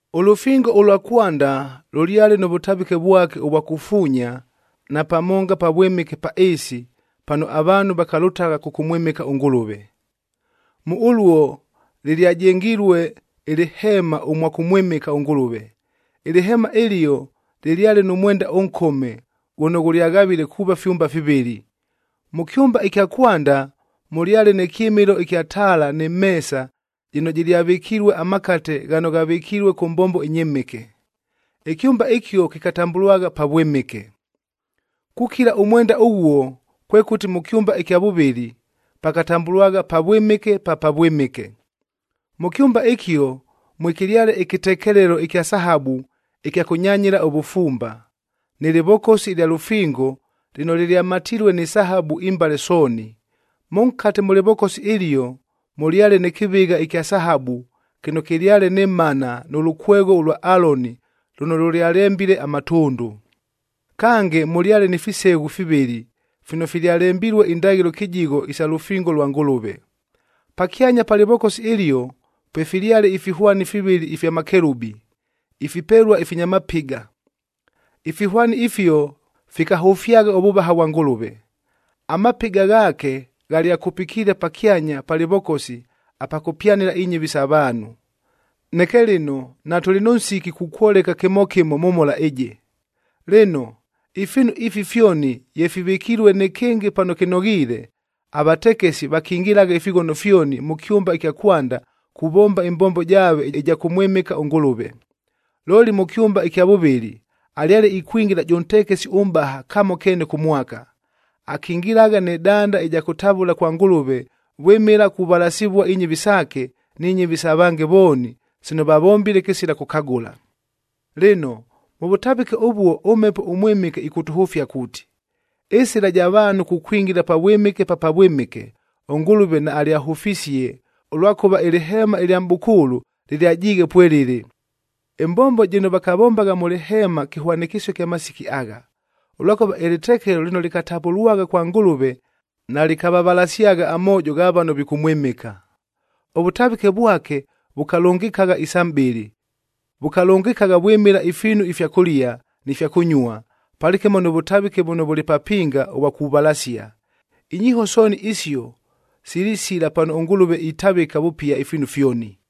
Ʉlʉfingo ʉlwa kwanda lʉlyale nʉ vʉtavɨke vwake ʉvwa kufuunya na pamonga pavwɨmɨke pa ɨɨsi, pano avaanhu vakalʉtagha kʉkʉmwɨmɨka ʉNgʉlʉve. Mʉ ʉluo lɨlyajengilue ɨlɨheema ʉmwa kʉmwɨmɨka ʉNgʉlʉve. Ɨlɨheema ɨlio lɨlyale nʉ mwenda ʉnkome ghʉno ghʉlyaghavile kuuva fyumba fivɨlɨ. Mʉ kyʉmba ɨkya kwanda mʉlyale nɨ kyɨmɨlo ɨkya taala nɨ meesa jɨno jɨlyavɨkilue amakate ghano ghavɨkilue kʉ mbombo ɨnyɨmɨke. Ɨkyʉmba ɨkio kɨkatambʉlwagha Pavwɨmɨke. Kukila ʉmwenda ʉghuo, kwekʉti mʉ kyʉmba ɨkya vʉvɨlɨ pakatambʉlwagha Pavwɨmɨke pa Pavwɨmɨke. Mʉ kyʉmba ɨkio mwekɨlyale ɨkɨtekelelo ɨkya sahabu ɨkya kʉnyanyɨla ʉvʉfumba, nɨ lɨvokosi ɨlya lʉfingoa lɨno lɨlyamatilue ni sahabu imbale sooni. Mʉnkate mʉ lɨvokosi ɨlio, mʉlyale nɨ kɨvɨgha ɨkya sahabu kɨno kɨlyale nɨ Manab nʉ lʉkwegho ʉlwa Aloni lʉno lʉlyalembile amatʉndʉ. Kange, mʉlyale ni fiseghu fivɨlɨ fino filyalembilue indaghɨlo kɨjigho isa lʉfingo lwa Ngʉlʉve. Pakyanya pa lɨvokosi ɨlio, pwefilyale ifihwani fivɨlɨ ifya makelubi ifipelua ifinya mapɨga. Ifihwani ifio fikahʉfyagha ʉvʉvaha vwa Ngʉlʉve. Amapɨga ghaake ghalyakupikiile pakyanya pa lɨvokosi apa kʉpyanɨla inyɨvi sa vaanhu. Neke lɨno, natʉlɨ nʉ nsiki kukwoleka kɨmo kɨmo mʉ mhola ɨjɨ. Lɨno, ifiinu ifi fyoni ye fivɨkilue nɨkɨngɨ pano kɨnoghiile, avatekesi vakingilagha ifighono fyoni mʉ kyʉmba ɨkya kwanda kuvomba ɨmbombo jaave ɨja kʉmwɨmɨka ʉNgʉlʉve. Looli mʉ kyʉmba ɨkya vʉvɨlɨ, alyale ikwingila jʉ ntekesi ʉmʼbaha kamo keene kʉ mwaka. Akingilagha nɨ danda ɨja kʉtavʉla kwa Ngʉlʉve vwɨmɨla kuvalasivua inyɨvi saake ni nyɨvi sa vange vooni sino vavombile kɨsila kʉkagʉla. Lɨno, mʉ vʉtavɨke ʉvuo ʉMhepo ʉMwɨmɨke ɨkʉtʉhʉfia kuuti, ɨsɨla ɨja vaanhu kukwingila Pavwɨmɨke pa Pavwɨmɨke, ʉNgʉlʉve naalyahʉfisie, ʉlwakʉva ɨlɨheema ɨlya mʼbʉkʉʉlʉ lɨlyajiighe pwelɨlɨ. Ɨmbombo jɨno vakavombagha mʉ lɨheema, kɨhwanɨkɨsio kya masiki agha, ʉlwakʉva ɨlɨtekelo lɨno lɨkatavʉlwagha kwa Ngʉlʉve, nalɨkavalasyagha amoojo gha vano vikʉmwɨmɨka. Ʉvʉtavɨke vwake vʉkalʉngɨkagha isa mʼbɨlɨ. Vʉkalʉngɨkagha vwɨmɨla ifiinu ifya kʉlia, ni fya kʉnyua, palɨkɨmo nʉ vʉtavɨke vʉno vʉlɨ papinga ʉvwa kuvalasia. Inyiiho sooni isio silisila pano ʉNgʉlʉve itavɨka vʉpia ifiinu fyoni.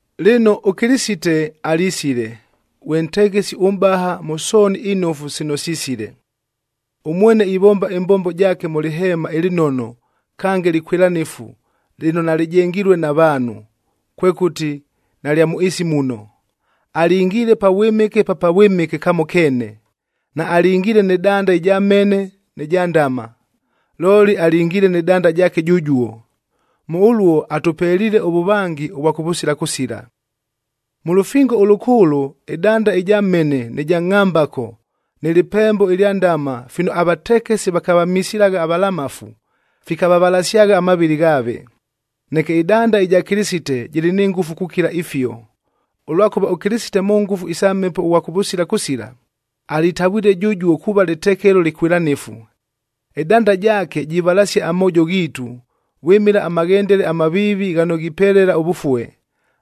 Lɨno, ʉKɨlɨsite alisile, ghwe ntekesi ʉmʼbaha mʉ sooni inofu sino sisile. Ʉmwene ivomba ɨmbombo jaake mʉ lɨheema ɨlɨnono, kange lɨkwɨlanɨfu lɨno nalɨjengilue na vaanhu, kwekʉti nalya mʉ ɨɨsi muno. Alingiile Pavwɨmɨke pa Pavwɨmɨke kamo keene, naalingiile nɨ danda ɨja mhene nɨ ja ndama, looli alingiile nɨ danda jaake jʉjuo. Mʉ ʉluo atʉpeliile ʉvʉvangi ʉvwa kʉvʉsila kʉsila. Mʉ lʉfingo ʉlʉkʉʉlʉ ɨdanda ɨja mhene nɨ ja ngʼhambako nɨ lɨpembo ɨlya ndama fino avatekesi vakavamisilagha avalamafu, fikavavalasyagha amavɨlɨ ghaave. Neke ɨdanda ɨja Kɨlɨsite jɨlɨ ni ngʉfu kukila ifio, ʉlwakʉva ʉKɨlɨsite mʉ ngʉfu isa Mhepo ʉghwa kʉvʉsila kʉsila, alitavwile jʉjuo kuuva lɨtekelo lɨkwɨlanɨfu. Ɨdanda jaake jivalasia amoojo ghiitu, vwɨmɨla amaghendele amaviivi ghano ghipelela ʉvʉfue,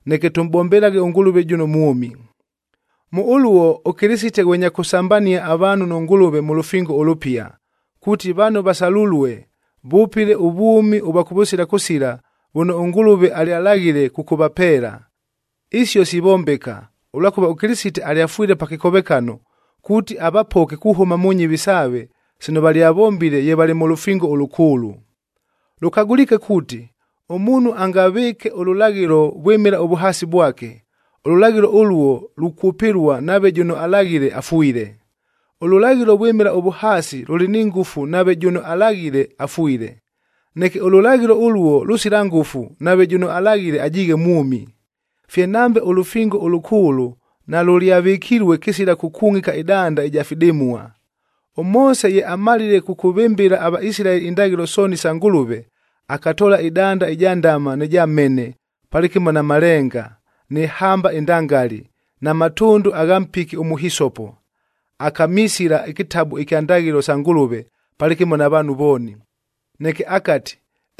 neke tʉmʼbombelaghe ʉNgʉlʉve jʉno mwʉmi. Mʉ ʉluo, ʉKɨlɨsite ghwe nya kʉsambania avaanhu nʉ Ngʉlʉve mʉ lʉfingo ʉlʉpia, kuuti vano vasalulue, vʉpɨle ʉvwʉmi ʉvwa kʉvʉsila kʉsila vʉno ʉNgʉlʉve alyalaghile kʉkʉvapeela. Isio sivombeka, ʉlwakʉva ʉKɨlɨsite alyafwile pa kɨkovekano, kuuti avapoke kuhʉma mʉ nyɨvi saave sino valyavombile ye valɨ mʉ lʉfingo ʉlʉkʉʉlʉ. Lʉkagʉliike kuuti, ʉmuunhu angavɨɨke ʉlʉlaghɨlo vwɨmɨla ʉvʉhaasi vwake, ʉlʉlaghɨlo ʉluo lukwʉpɨlua nave jʉno alaghile afwile. Ʉlʉlaghɨlo vwɨmɨla ʉvʉhaasi lʉlɨ ni ngʉfu nave jʉno alaghile afwile. Neke ʉlʉlaghɨlo ʉluo lʉsila ngʉfu nave jʉno alaghile ajiighe mwʉmi. Fye nambe ʉlʉfingo ʉlʉkʉʉlʉ nalʉlyavɨkilue kɨsila kʉkungʼika ɨdanda ɨja fidɨmua. ɄMoose ye amalile kʉkʉvɨmbɨla aVaisilaeli indaghɨlo sooni isa Ngʉlʉve, akatoola ɨdanda ɨja ndama nɨ ja mhene, palɨkɨmo na malenga, nɨ hamba ɨndangali, na matʉndʉ agha mpiki ʉmʉhisopo, akamisila ɨkɨtabu ɨkya Ndaghɨlo sa Ngʉlʉve palɨkɨmo na vaanhu vooni. Neke akati,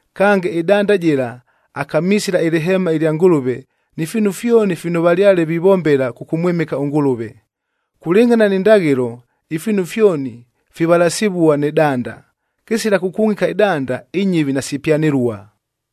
Kange, ɨdanda jɨla akamisila ɨlɨheema ɨlya Ngʉlʉve ni fiinu fyoni fino valyale vivombela kʉkʉmwɨmɨka ʉNgʉlʉve. Kulɨngʼhana ni ndaghɨlo, ifiinu fyoni fivalasivua nɨ danda, kɨsila kʉkungʼika ɨdanda inyɨvi nasipyanɨlua.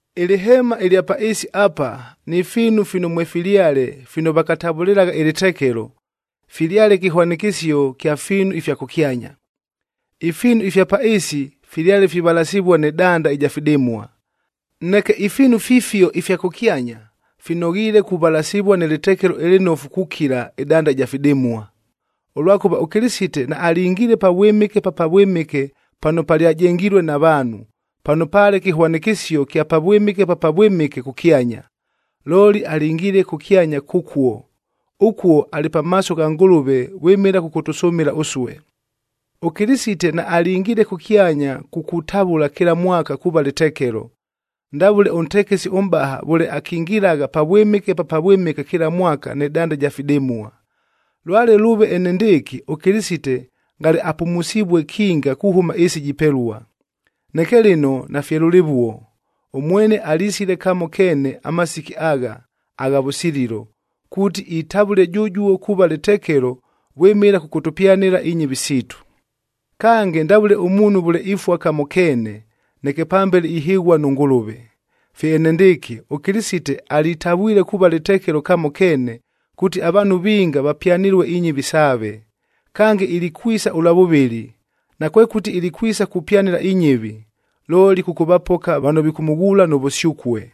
Ɨlɨheemad ɨlya pa ɨɨsi apa ni fiinu fino mwefilyale fino vakatavʉlɨlagha ɨlɨtekelo, filyale kɨhwanɨkɨsio kya fiinu ifya kʉkyanya. Ifiinu ifya pa ɨɨsi filyale fivalasivua nɨ danda ɨja fidɨmua. Neke ifiinu fifio ifya kʉkyanya, finoghiile kuvalasivua nɨ lɨtekelo ɨlɨnofu kukila ɨdanda ɨja fidɨmua. Ʉlwakʉva ʉKɨlɨsite naalingiile Pavwɨmɨke pa Pavwɨmɨke pano palyajengilue na vaanhu, pano paale kɨhwanɨkɨsio kya Pavwɨmɨke pa Pavwɨmɨke kʉkyanya. Looli alingiile kʉkyanya kʉkuo, ʉkuo alɨ pamaaso gha Ngʉlʉve vwɨmɨla kʉkʉtʉsʉmɨla ʉsue. ɄKɨlɨsite naalingiile kʉkyanya kukutavʉla kɨla mwaka kuuva lɨtekelo, ndavʉle ʉntekesi ʉmʼbaha vʉle akingilagha Pavwɨmɨke pa Pavwɨmɨke kɨla mwaka nɨ danda ɨja fidɨmua. Lwale lʉʉve enendɨɨkɨ, ʉKɨlɨsite ngale apʉmusivue kinga kuhʉma ɨɨsi jipelua. Neke lɨno nafye lʉlɨvuo! Ʉmwene alisile kamo keene amasiki agha, agha vʉsililo, kuuti itavʉle jʉjuo kuuva lɨtekelo vwɨmɨla kʉkʉtʉpyanɨla inyɨvi siitu. Kange, ndavʉle ʉmuunhu vʉle ifua kamo keene, neke pambele ihɨghua nʉ Ngʉlʉve, fye enendɨɨkɨ, ʉKɨlɨsite alitavwile kuuva lɨtekelo kamo keene, kuuti avaanhu vinga vapyanɨlue inyɨvi saave. Kange ilikwisa ʉlwa vʉvɨlɨ, nakwekʉti ilikwisa kupyanɨla inyɨvi, looli kʉkʉvapoka vano vikʉmʉghuula nʉ vʉsyʉkue.